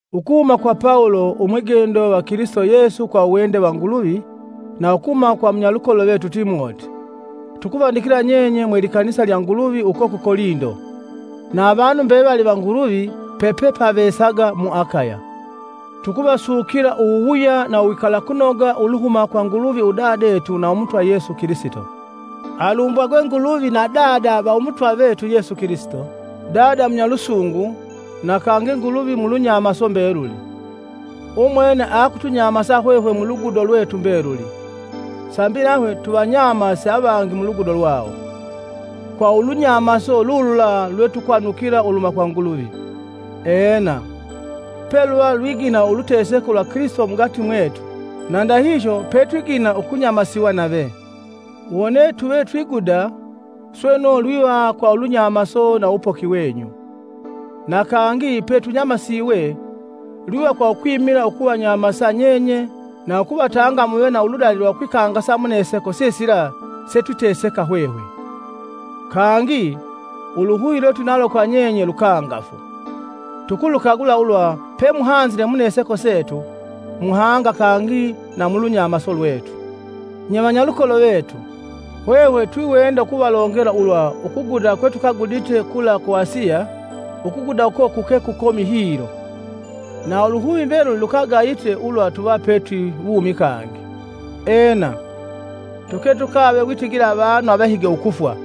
Ukuhuma kwa Pawulo, umwigendo va Kilisito Yesu kwa uwende wa Nguluvi, na ukuhuma kwa munyalukolo vetu Timoti, tukuvandikila nyenye mwe likanisa lya Nguluvi uko ku Kolindo, na avanu mbevali va Nuguluvi pepepavesaga mu Akaya. Tukuvasukila uwuwuya na uwikalakunoga uluhuma kwa Nguluvi udadetu na Umutwa Yesu Kilisito. Alumbwagwe Nguluvi na Dada va Umutwa vetu Yesu Kilisito, Dada munyalusungu na kangi Nguluvi mulunyamaso mbeluli. Umwene akutunyamasa hwehwe mulugudo lwetu mbeluli, sambi nahwe tuvanyamase avangi muludugo lwawo, kwa ulunyamaso lulula lwetukwanukila uluhuma kwa Nguluvi. Ena, peluva lwigina uluteseko lwa Kilisito mugati mwetu, na ndahihyo petwigina ukunyamasiwa nave. Wone tuve twiguda, sweno lwiva kwa ulunyamaso na uwupoki wenyu. Na kangi petunyamasiwe, lwiva kwa ukwimila ukuvanyamasa nyenye na ukuvatanga muve na uludali lwa ukwikangasa muneseko sisila setwiteseka hwehwe. Kangi, uluhuvi lwetwinalo kwa nyenye lukangafu; tukulukagula ulwa pemuhanzile muneseko setu, muhanga kangi na mu lunyamaso lwetu. Nye vanyalukolo vetu, hwehwe twiwenda ukuvalongela ulwa ukuguda kwetukagudite kula ku Asiya; ukuguda uko kuke kukomi hilo, na uluhuvi mbeluli lukagayite ulwa tuva petwi wumi kangi. Ena, tuke tukave witigila avanu avahige ukufwa,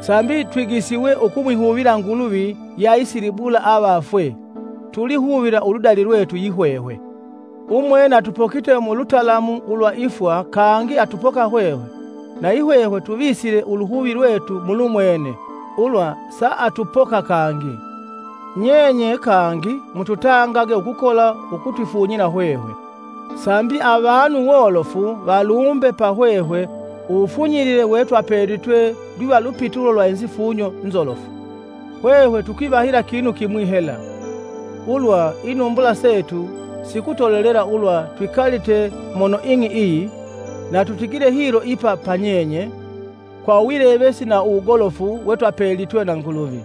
sambi twigisiwe ukumwihuvila Nguluvi yeaisilibula avafwe, tulihuvila uludali lwetu yihwehwe. Umwene atupokite mu lutalamu ulwa ifwa kangi atupoka hwehwe na yihwehwe tuvisile uluhuvi lwetu mulumwene ulwa saatupoka kangi, nyenye kangi ututangage ukukola ukutwifunyila hwehwe, sambi avanu wolofu valumbe pa hwehwe uwufunyilile wetwapelitwe lwiva lupitulo lwa inzifunyo nzolofu. Hwehwe tukwivahila kinu kimwi hela: ulwa inumbula setu sikutolelela ulwa twikalite mono ing'i iyi, na tutigile hilo ipa pa nyenye, kwa uwilevesi na uwugolofu wetwapelitwe na Nguluvi;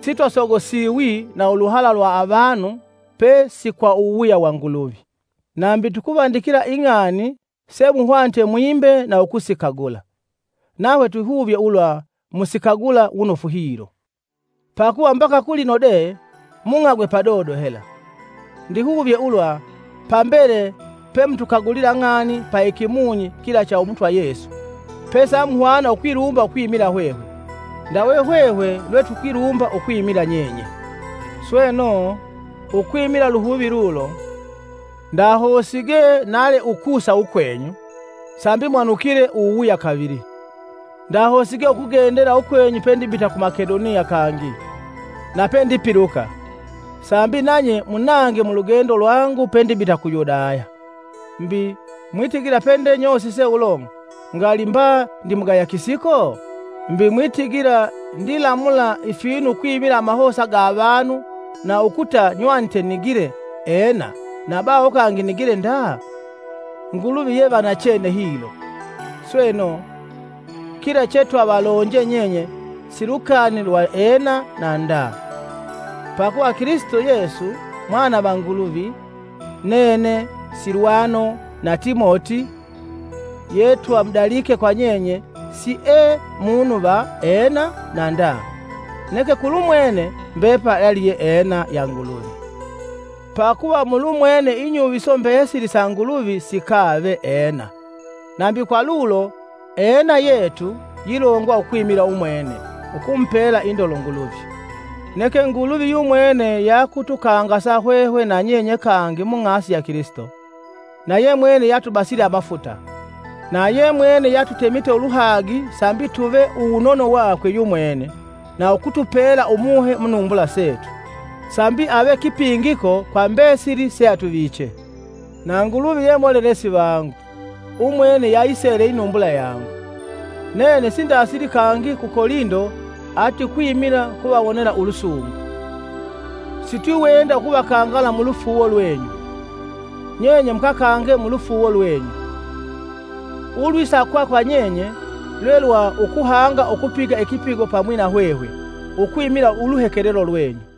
sitwasogosiwi na uluhala lwa avanu pesi kwa uwuwuya wa Nguluvi. Nambi tukuvandikila Ing'ani semuhwanite mwimbe na ukusikagula. Nahwe twihuvye ulwa musikagula wunofu hilo, Pakuva mbaka kulino de mung'agwe padodo hela. Ndihuvye ulwa pambele pemutukagulila ng'ani pa ikimunyi kila cha Umutwa Yesu, pesamuhwana ukwilumba ukwimila hwehwe, ndawe hwehwe lwe tukwilumba ukwimila nyenye. Sweno, ukwimila uluhuvi lulo, ndahosige nale ukusa ukwenyu, sambi mwanukile uwuwuya kavili. Ndahosige ukugendela ukwenyu pendibita ku Makedoniya kangi, na pendipiluka, sambi nanye munange mulugendo lwangu pendibita ku Yudaya. Mbi, mwitigila pende nyosise ulo ngali mba ndimugaya kisiko? Mbi, mwitigila ndilamula ifinu ukwimila amahosa ga avanu na ukuta nywanite nigile “Ena” na baho kangi nigile “Nda?” Nguluvi ye va nachene hilo; sweno, kila chetwavalonje nyenye si lukani lwa “Ena” na “Nda.” Pakuva Kilisito Yesu, Mwana va Nguluvi, nene, Silwano na Timoti yetwamudalike kwa nyenye, siee munu va “Ena” na “Nda” neke kulumwene mbepali aliye “Ena” ya Nguluvi. Pakuva mulumwene inyuviso mbesili sa Nguluvi sikave “Ena, Nambi kwa lulo “Ena” yetu yilongwa ukwimila umwene, ukumupela indolo Nguluvi. Neke Nguluvi yumwene yakutukangasa hwehwe na nyenye kangi mung'asi ya Kilisito, na ye mwene yatubasile amafuta, na ye mwene yeatutemite uluhagi sambi tuve uwunono wakwe yumwene na ukutupela Umuhe munumbula setu sambi ave kipingiko kwa mbesili seatuviche. Na Nguluvi ye molelesi vangu, umwene yayisele inumbula yangu! Nene sindasili kangi ku Kolindo ati ukwimila kuvawonela ulusungu. Sitwiwenda ukuvakangala mu lufuuwo lwenyu; nyenye mukakange mulufuuwo lwenyu. Ulwisakwa kwa nyenye, lwe lwa ukuhanga ukupiga ikipigo pamwi na hwehwe, ukwimila uluhekelelo lwenyu.